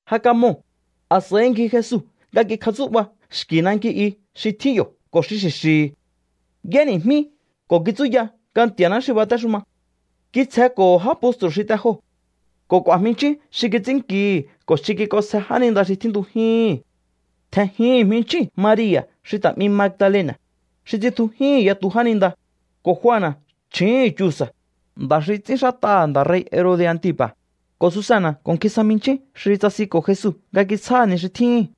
Ja kamoo̱, a̱s'a̱i ngji Jesu nga kikjatsú'ba xki̱ nanki i xi tjín yo̱ ko̱ xi xi̱xi̱hi̱. Y'éni̱jmí ko̱ kitsúya nga Nti̱a̱ná xi batéxuma. Kitsjenko̱ho̱ já postru̱ xi te joo̱ ko̱ k'u̱a̱ jminchjín xi kits'ínnkihi̱ ko̱ xi kik'onsje jáninda xi tjíntujíhi̱n. Tje̱njihi̱n jminchjíu̱n Maria̱ xi ta̱ 'mi Magdalena̱, xi tsitjujíhi̱n yatu jáninda, ko̱ Juana̱ chju̱úhu̱n Chuza̱, nda̱ xi ts'ínxát'aha̱ nda̱ rei̱ Herode̱ Antipa̱, ko̱ Susana̱ ko̱ nkjin sa jminchjín xi tsasinko̱ Jesu nga kitsjáha̱ ni xi tjíhi̱n.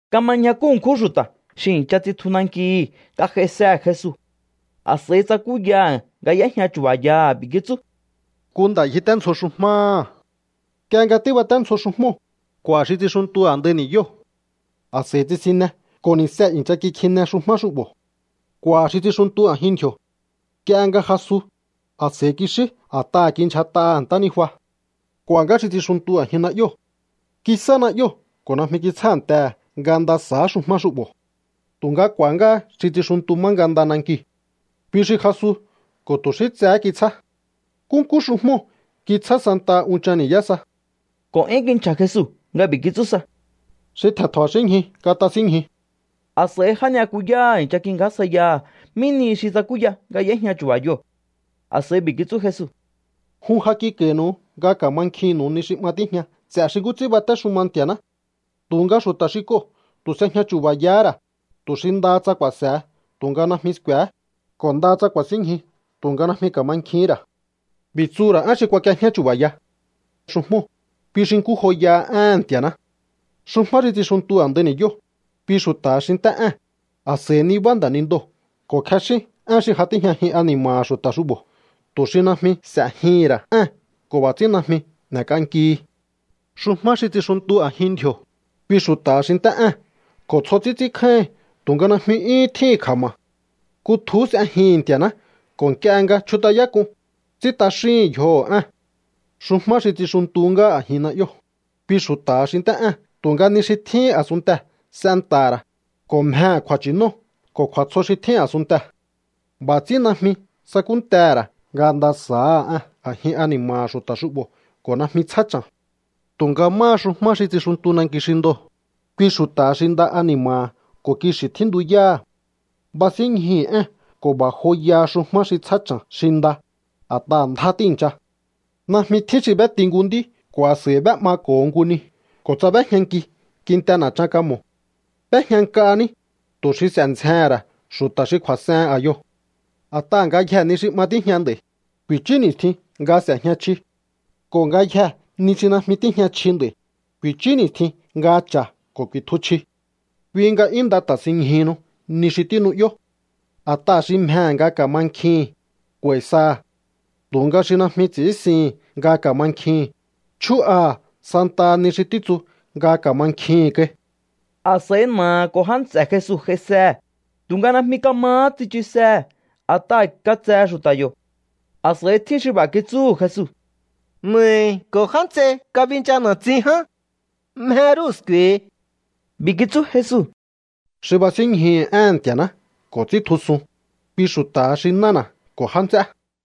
Kama ñjakú ṉkjún xu̱ta̱ xi i̱ncha tsitju nankihi̱ nga j'aisehe̱ Jesu. A̱s'a̱i tsakúyaha̱ nga y'éjña chu̱ba̱yaha̱. B'i̱ kitsú: —Nku nda̱ ngjiténdzjo xujmáha̱. Nk'ie nga tíbaténdzjo xujmóo̱, k'u̱a̱ xi tsixuntu a̱ndai ni̱yóo̱. A̱s'a̱i tsisinne ko̱ ni̱see̱ i̱ncha kikjine xujmá xu'bo̱. K'u̱a̱ xi tsixuntu a̱jin ndji̱o̱. Nk'ie nga jasu, a̱s'a̱i kixí a̱t'aha̱ kindyjat'aha̱ ntánijua. K'u̱a̱ ngá xi tsixuntu a̱jin na'yóo̱. Kisá na'yóo̱ ko̱ najmi kitsjántehe̱ nga nda sa̱á xujmá xu'bo̱. Tu̱nga k'u̱a̱há ngá xi tsixuntu má nga nda nankiu̱. Kui xi jasu ko̱ tu̱ xí tsehé kitsjá. Nkúnkú xujmóo̱ kitsjá santaha unchan ni̱yá sa. Ko̱ 'yún kinchja̱ Jesu nga b'i̱ kitsú sa: —Xi tje̱n tja̱ba̱xínñju katasínñju. A̱s'a̱i já ni'yakuyáha̱ i̱ncha kingjásjaiyaha̱ mí nihi xi tsakúya nga y'éjña chu̱ba̱yoo̱. A̱s'a̱i b'i̱ kitsú Jesu: —Jun ja kik'a̱i̱nu̱u nga ka̱mankjinnu̱u ni xi 'ma tíjña ts'e̱ xi nkú ts'ín batéxuma Nti̱a̱ná. Tu̱nga xu̱ta̱ xi k'oo̱ tu̱ s'ejña chu̱ba̱yahá ra̱, tu̱ xi ndaha tsa ku̱a̱se̱he tu̱nga najmi sku̱e̱hé, ko̱ ndaha tsa ku̱a̱sínñju tu̱nga najmi ka̱mankjihín ra̱. ’B'i̱ tsuhu̱ ra̱ én xi kuak'iejñá chu̱ba̱ya. Xujmóo̱, kui xi nkú joyaha éhe̱n Nti̱a̱ná. Xujmá xi tsixuntu a̱ndai ni̱yóo̱, kui xu̱ta̱ha xi nt'é ée̱n, a̱s'a̱i nibá nda̱nindoo̱ ko̱ kjexín én xi ja tíjñajin ani̱ma̱ha̱ xu̱ta̱ xu'bo̱ tu̱ xi najmi s'e̱jihi̱n ra̱ ée̱n ko̱ b'a̱ ts'ín najmi n'e̱k'ankihi. ’Xujmá xi tsixuntu a̱jin ndji̱o̱, kui xu̱ta̱ha xi nt'é ée̱n ko̱ tsjo ts'ín ts'ínkjáíhi̱n tu̱nga najmi 'yúhún tjíhi̱n kja̱ma̱. Kutjuhú s'ejihi̱n Nti̱a̱ná ko̱ nk'ie nga chjut'ayák'un, ts'ín t'axíhi̱n yjoho̱ ée̱n. ’Xujmá xi tsixuntu ngá a̱jin na'yóo̱, kui xu̱ta̱ha xi nt'é ée̱n tu̱nga ni xi tjíhín a̱sunntee̱ s'enta̱ha̱ ra̱, ko̱ mjehe̱ kju̱a̱nchi̱nóo̱ ko̱ kju̱a̱tsjo xi tjín a̱sunntee̱. B'a̱ ts'ín najmi sakúntehe̱ ra̱ nga nda sa̱áha ée̱n a̱jin ani̱ma̱ha̱ xu̱ta̱ xu'bo̱ ko̱ najmi tsjá cha̱n. ’Tu̱nga máha xujmá xi tsixuntu nanki xi ndoo̱, kui xu̱ta̱ha xi nda ani̱ma̱ha̱ ko̱ kixi̱ tjíntuyáha̱. Basínñjuhu̱ ée̱n ko̱ b'a̱ joyaha xujmá xi tsjá cha̱n xi nda, a̱t'aha̱ ndjá tíi̱ncha. ’Najmi tjín xi b'éti nku nd'í ko̱ a̱s'a̱i b'é'mako̱ho nku ni ko̱ tsa b'éjñanki kinte na̱chan kamo̱. B'éjña nk'a ní, tu̱ xi s'e̱ ndzjehe̱n ra̱ xu̱ta̱ xi kju̱a̱s'ehen a̱yoo̱. A̱t'aha̱ ngayjee̱ ni xi 'ma tíjña nd'a̱i̱, ku̱i̱chú ni̱stjin nga s'e̱jña chji. Ko̱ ngayjee̱ ni xi najmi tíjña chji nd'a̱i̱, ku̱i̱chú ni̱stjin nga cha̱ ko̱ ku̱i̱tju chji. Kui nga 'yún nda ta̱sinñjuhunu ni xi tínu'yó. A̱t'aha̱ xi mjehe̱ nga ka̱mankjihi̱n, k'u̱a̱i̱ saha̱. Tu̱nga xi najmi ts'i̱ínsihi̱n nga ka̱mankjihi̱n, chjú'aha̱ santaha ni xi títsu nga ka̱mankjihi̱n kai. A̱s'a̱i na̱aha̱ ko̱ já nts'e̱ Jesu j'aisehe̱, tu̱nga najmi kamahá tsichusehe̱ a̱t'aha̱ katsehe xu̱ta̱ yo̱. A̱s'a̱i tjín xi b'a̱ kitsúhu̱ Jesu: —Na̱ahi̱ ko̱ já nts'ei kabincha na̱tsin ján. Mje rúhu̱ sku̱e̱hi. B'i̱ kitsú Jesu: —Xi basínñjuhu̱ éhe̱n Nti̱a̱ná ko̱ ts'íntjusun, kui xu̱ta̱ha xi nána̱ ko̱ já nts'é.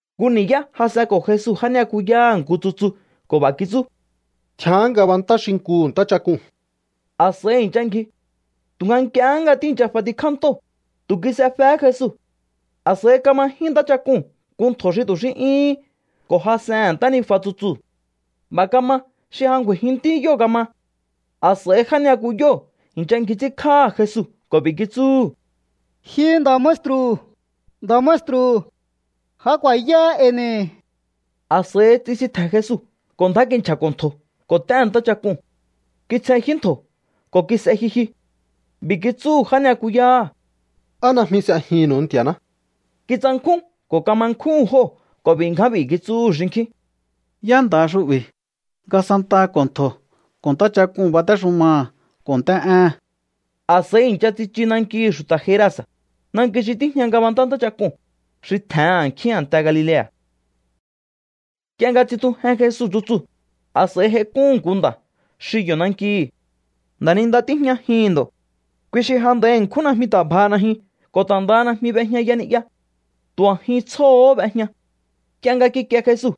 Nku ni̱yá jas'enko̱ Jesu já ni'yakuyáha̱ nku tsutsu ko̱ b'a̱ kitsú: —Tjián ngabantá xinkuhu̱ ntáchak'uu̱n. A̱s'a̱i i̱ncha ngji. Tu̱nga nk'iehé nga tíi̱ncha f'atikjá ntóo̱, tu̱ kis'efehé Jesu. A̱s'a̱i kamajín ntáchak'uu̱n nku ntjo̱ xi tu̱ xí 'yúhún ko̱ jas'ehe̱n ntánijua tsutsuu̱. B'a̱ kama xi ja ngju̱a̱i̱jinntí yóo̱ kama. A̱s'a̱i já ni'yakuyóo̱ i̱ncha ngji ts'ínkj'áha̱ Jesu ko̱ b'i̱ kitsúhu̱: —¡Ji nda̱ maestru̱, nda̱ maestru̱! ¡Ja ku̱a̱yáá e̱i̱ ni̱! A̱s'a̱i tsisintje̱n Jesu ko̱ ndjá kinchja̱ko̱ ntjo̱ ko̱ t'éhe̱n ntáchak'uu̱n. Kitsjenjyú ntjo̱ ko̱ kis'e jyujyu. B'i̱ kitsúhu̱ já ni'yakuyáha̱: —¿Á najmi s'ejihi̱nnu̱u Nti̱a̱ná? Kitsankjún ko̱ kama nkjúhu̱n jóo̱ ko̱ b'i̱ ngján b'i̱ kitsúhu̱ xinkjín: —¿Yá nda̱ha xu'bi̱ nga santaha ko̱ ntjo̱ ko̱ ntáchak'uu̱n batéxumaha̱ ko̱ nt'é'éhe̱n? A̱s'a̱i i̱ncha tsichu nankihi̱ xu̱ta̱ Gerasa̱, nanki xi tíjña ngabantá ntáchak'uu̱n, xi tje̱hen a̱nkjín a̱nte Galilea̱. Nk'ie nga tsitjujen Jesu tsutsuu̱, a̱s'a̱i j'aik'úhu̱n nku nda̱ xi yo̱ nankihi̱. Nda̱ninda tíjñajihi̱n ndo̱. Kui xi ja nd'a̱i ṉkjún najmi ta̱ bjaha najyun ko̱ ta̱ ndaha najmi b'ejñaya ni'ya. Tu̱ a̱jin tsjóo̱hó b'ejña. Nk'ie nga kikie Jesu,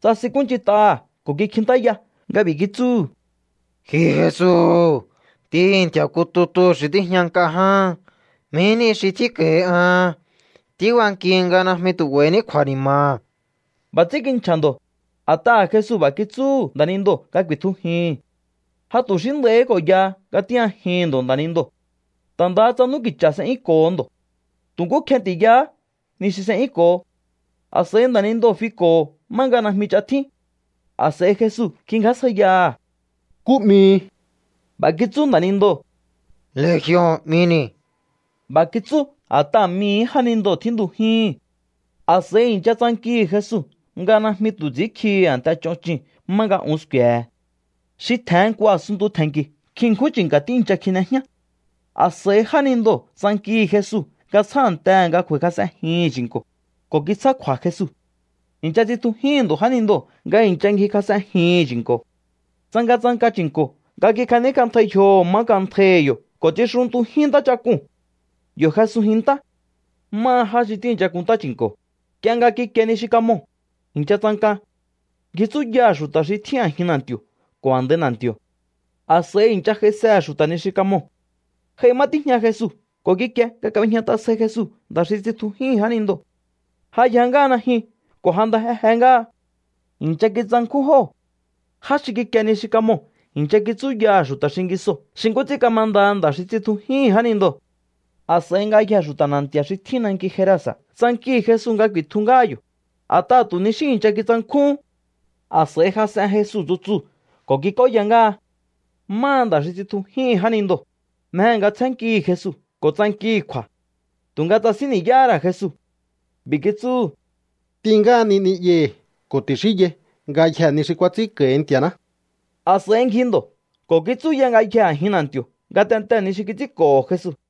tsasinkúnch'int'aha̱ ko̱ kikjintáya nga b'i̱ kitsúhu̱: —Ji Jesu, Ntíhi̱ Nti̱a̱ nku tutu xi tíjña nk'a ján, ¿mí nihi xi tjínko̱hi an? Tíbankihi nga najmi tu̱ 'ba̱i̱ní kju̱a̱ni̱ma̱. B'a̱ ts'ín kinchja̱ ndo̱, a̱t'aha̱ Jesu b'a̱ kitsúhu̱ nda̱nindoo̱ nga ku̱i̱tjujihi̱n. Ja tu̱ xí nd'a̱i̱hí ko̱ yaha nga tíjñajihi̱n ndo̱ nda̱nindoo̱. Ta̱ nda tsa n'úki̱cha̱ s'e'yúnko̱ho ndo̱. Tu̱ nkú kjeti̱yahá ni xi s'e'yúnko̱ho. A̱s'a̱i nda̱nindoo̱ fiko̱ho̱ má nga najmi ch'a tjín. A̱s'a̱i Jesu kingjásjaiyaha̱: —¿Nkú 'mihi? B'a̱ kitsú nda̱nindoo̱: —Legion 'mini̱. B'a̱ kitsú a̱t'aha̱ mii̱hí jánindoo̱ tjíntujíhi̱n. A̱s'a̱i i̱ncha tsankihi̱ Jesu nga najmi tu̱ ts'i̱ínkjihi̱ a̱nte ch'on chuu̱n má nga un sku̱e̱he̱. Xi tje̱hen nku a̱sunntu tje̱nki̱ nkjin ṉkjún chi̱nka̱ tíi̱ncha kjine jñá. A̱s'a̱i jánindoo̱ tsankihi̱ Jesu nga tsjántehe̱ nga ngju̱a̱i̱kjas'enjihi̱n chi̱nko̱, ko̱ kitsjá kju̱a̱ Jesu. I̱ncha tsitjujíhi̱n ndo̱ jánindoo̱ nga i̱ncha ngjikjas'enjihi̱n chi̱nko̱. Tsangatsanka chi̱nko̱ nga kikjaníkj'antjai yjoho̱ má nk'antjaihi̱ yo̱ ko̱ tsixuntujín ntáchak'uu̱n. Yo̱ jesunjin ntá. Máha já xi tíi̱ncha kunntá chi̱nko̱, nk'ie nga kikie ni xi kamoo̱, i̱ncha tsanka. Ngji tsúyaha̱ xu̱ta̱ xi tjín a̱jin na̱nti̱o̱ ko̱ a̱ndai na̱nti̱o̱. A̱s'a̱i i̱ncha j'aisehe̱ xu̱ta̱ ni xi kamoo̱. J'ai má tíjña Jesu ko̱ kikie nga kab'ejñat'a sjai Jesu nda̱ xi tsitjujíhi̱n jánindoo̱. Ja yja ngáha najyun ko̱ ja nda jeje ngáha. I̱ncha kitsankjún jóo̱. Já xi kikie ni xi kamoo̱ i̱ncha kitsúyaha̱ xu̱ta̱ xingisoo̱ xi nkú ts'ín kamandaha nda̱ xi tsitjujíhi̱n jánindoo̱. A̱s'a̱i ngayjee̱ xu̱ta̱ na̱nti̱a̱ xi tjín nanki Gerasa̱ tsankihi̱ Jesu nga ku̱i̱tju ngáha yo̱, a̱t'aha̱ tu̱ ni xí i̱ncha kitsankjúhún. A̱s'a̱i jas'en Jesu tsutsuu̱ ko̱ kik'óya ngáha. Máha nda̱ xi tsitjujíhi̱n jánindoo̱, mjehe̱ nga tsjénnkihi̱ Jesu ko̱ tsankihi̱ kju̱a̱. Tu̱nga tsasín ni̱yáhá ra̱ Jesu. B'i̱ kitsúhu̱: —T'in ngáhani ni'yahi̱ ko̱ ti̱xínyai ngayjee̱ ni xi kuats'ínko̱hi Nti̱a̱ná. A̱s'a̱i ngji ndo̱ ko̱ kitsúya ngayjee̱ a̱jin na̱nti̱o̱ ngatentee̱ ni xi kits'ínko̱ho̱ Jesu.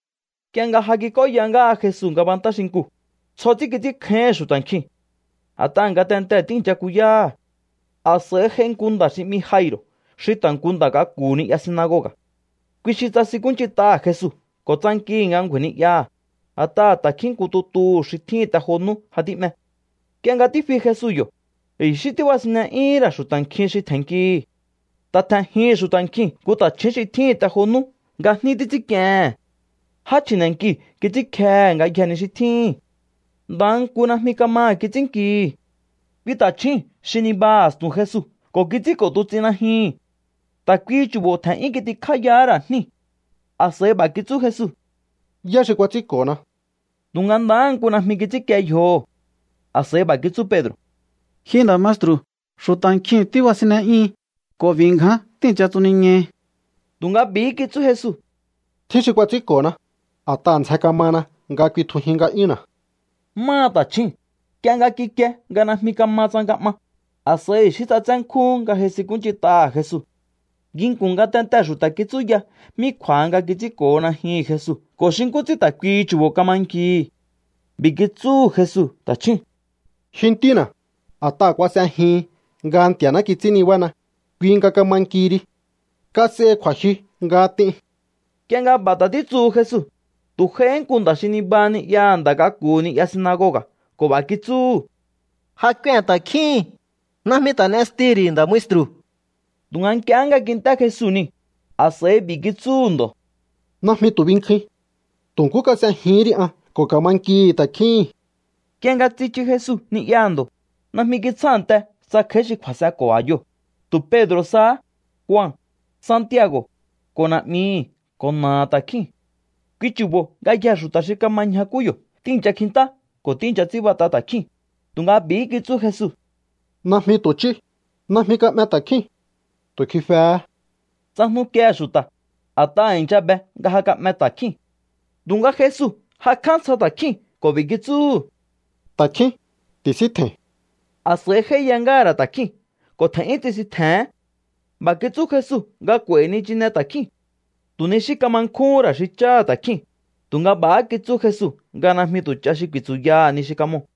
Nk'ie nga ja kik'óya ngáha Jesu ngabantá xinkuu̱, tsjo ts'ín kits'ínkjáíhi̱n xu̱ta̱ nkjiu̱n, a̱t'aha̱ ngatentee̱ tíi̱ncha kuyáha̱. A̱s'a̱i j'ai nku nda̱ xi 'mi Jairo̱ xi ta̱ nku nda̱ k'aku̱hu̱ ni'ya sinagoga̱. Kui xi tsasinkúnch'int'aha̱ Jesu ko̱ tsankihi̱ nga ngju̱a̱i̱ ni'yaha̱, a̱t'aha̱ ta̱kjín nku tutuhu̱ xi tjíhi̱n te jo nú ja tí'me. Nk'ie nga tífi Jesu yo̱, i̱xí tíbasinne'yúhún ra̱ xu̱ta̱ nkjin xi tje̱nnkihi̱. Ta̱ tje̱njihi̱n xu̱ta̱ nkjiu̱n nku ta̱chju̱ún xi tjíhi̱n te jo nú nga jní títs'ínk'iehe̱n. Já chji̱ne̱nki kits'ínkjehe ngayjee̱ ni xi tjíhi̱n. Ndaha nku najmi kamaha̱ kits'ínnkihi̱. Kui ta̱chjúu̱n xi nibaha a̱stu̱n Jesu ko̱ kits'ínko̱ tuts'in najyuhu̱n. Ta̱ kuihi chu̱bo̱ tje̱n'yún kitikjáyahá ra̱ jníu̱. A̱s'a̱i b'a̱há kitsú Jesu: —¿Yá xi kuats'ínko̱na? Tu̱nga ndaha nku najmi kits'ínkie yjoho̱. A̱s'a̱i b'a̱ kitsú Pedro̱: —Ji nda̱ maestru̱, xu̱ta̱ nkjiu̱n tíbasinne'yíhin ko̱ b'i̱ ngján tíi̱ncha tsuniñaihi. Tu̱nga b'i̱hí kitsú Jesu: —Tjín xi kuats'ínko̱na, a̱t'aha̱ ndzjen kamana nga kuitjujin nga'yúnna̱. Máha ta̱chjúu̱n, nk'ie nga kikie nga najmi kama tsanka 'ma, a̱s'a̱i i̱xí ts'atsé nkjúhún nga j'aisinkúnch'int'aha̱ Jesu. Nginku̱n ngatentee̱ xu̱ta̱ kitsúya mí kju̱a̱ha nga kits'ínko̱ho najyuhu̱n Jesu ko̱ xi nkú ts'ín ta̱ kuihi chu̱bo̱ kama nkihi̱. B'i̱ kitsúhu̱ Jesu ta̱chjúu̱n: —Ji ntína̱, a̱t'aha̱ kuas'ejihin nga Nti̱a̱ná kits'ín nibána, kui nga kama nkihi ri. Kas'ehi kju̱a̱jyu nga t'in. Nk'ie nga b'a̱ ta̱ títsuhu Jesu, tu̱ j'aihí nku nda̱ xi nibaha ni'yaha̱ nda̱ k'aku̱hu̱ ni'ya sinagoga̱ ko̱ b'a̱ kitsúhu̱: —Ja k'uen ta̱kjíhi̱n. Najmi ta̱ n'estihi̱ ri̱ nda̱ maestru̱. Tu̱nga nk'ie nga kint'é Jesu niu̱, a̱s'a̱i b'i̱ kitsúhu̱ ndo̱: —Najmi tu̱ binkjuin. Tu̱ nkú kas'ejihín ri an ko̱ ka̱ma nkihi̱ ta̱kjíhi̱n. Nk'ie nga tsichu Jesu ni'yaha̱ ndo̱, najmi kitsjánte tsa kj'a̱í xi kju̱a̱s'enko̱ a̱yoo̱, tu̱ Pedro̱ sahá, Jua, Santiago̱, ko̱ na̱'mihi̱ ko̱ na̱aha̱ ta̱kjíu̱n. Kui chu̱bo̱ ngayjee̱ xu̱ta̱ xi kama ñjakú yo̱ tíi̱ncha kjintá ko̱ tíi̱ncha ts'ínbat'a ta̱kjíu̱n, tu̱nga b'i̱hí kitsú Jesu: —Najmi tu̱ ch'íú. Najmi ka'me ta̱kjíu̱n. Tu̱ kjifehé. Tsajnukiehe̱ xu̱ta̱, a̱t'aha̱ i̱ncha be nga ja ka'me ta̱kjíu̱n. Tu̱nga Jesu jakj'á ntsja ta̱kjíu̱n ko̱ b'i̱ kitsúhu̱: —Ta̱kjín, ti̱síntje̱i̱n. A̱s'a̱i j'áíya ngáha̱ ra̱ ta̱kjíu̱n ko̱ tje̱n'yún tsisintje̱hén. B'a̱ kitsú Jesu nga k'u̱a̱i̱hi̱ nichine ta̱kjíu̱n. Tu̱ ni xí kama nkjúhún ra̱ xi cháha̱ ta̱kjíu̱n, tu̱nga b'a̱há kitsú Jesu nga najmi tu̱ ch'a xi ku̱i̱tsu̱yaha̱ ni xi kamoo̱.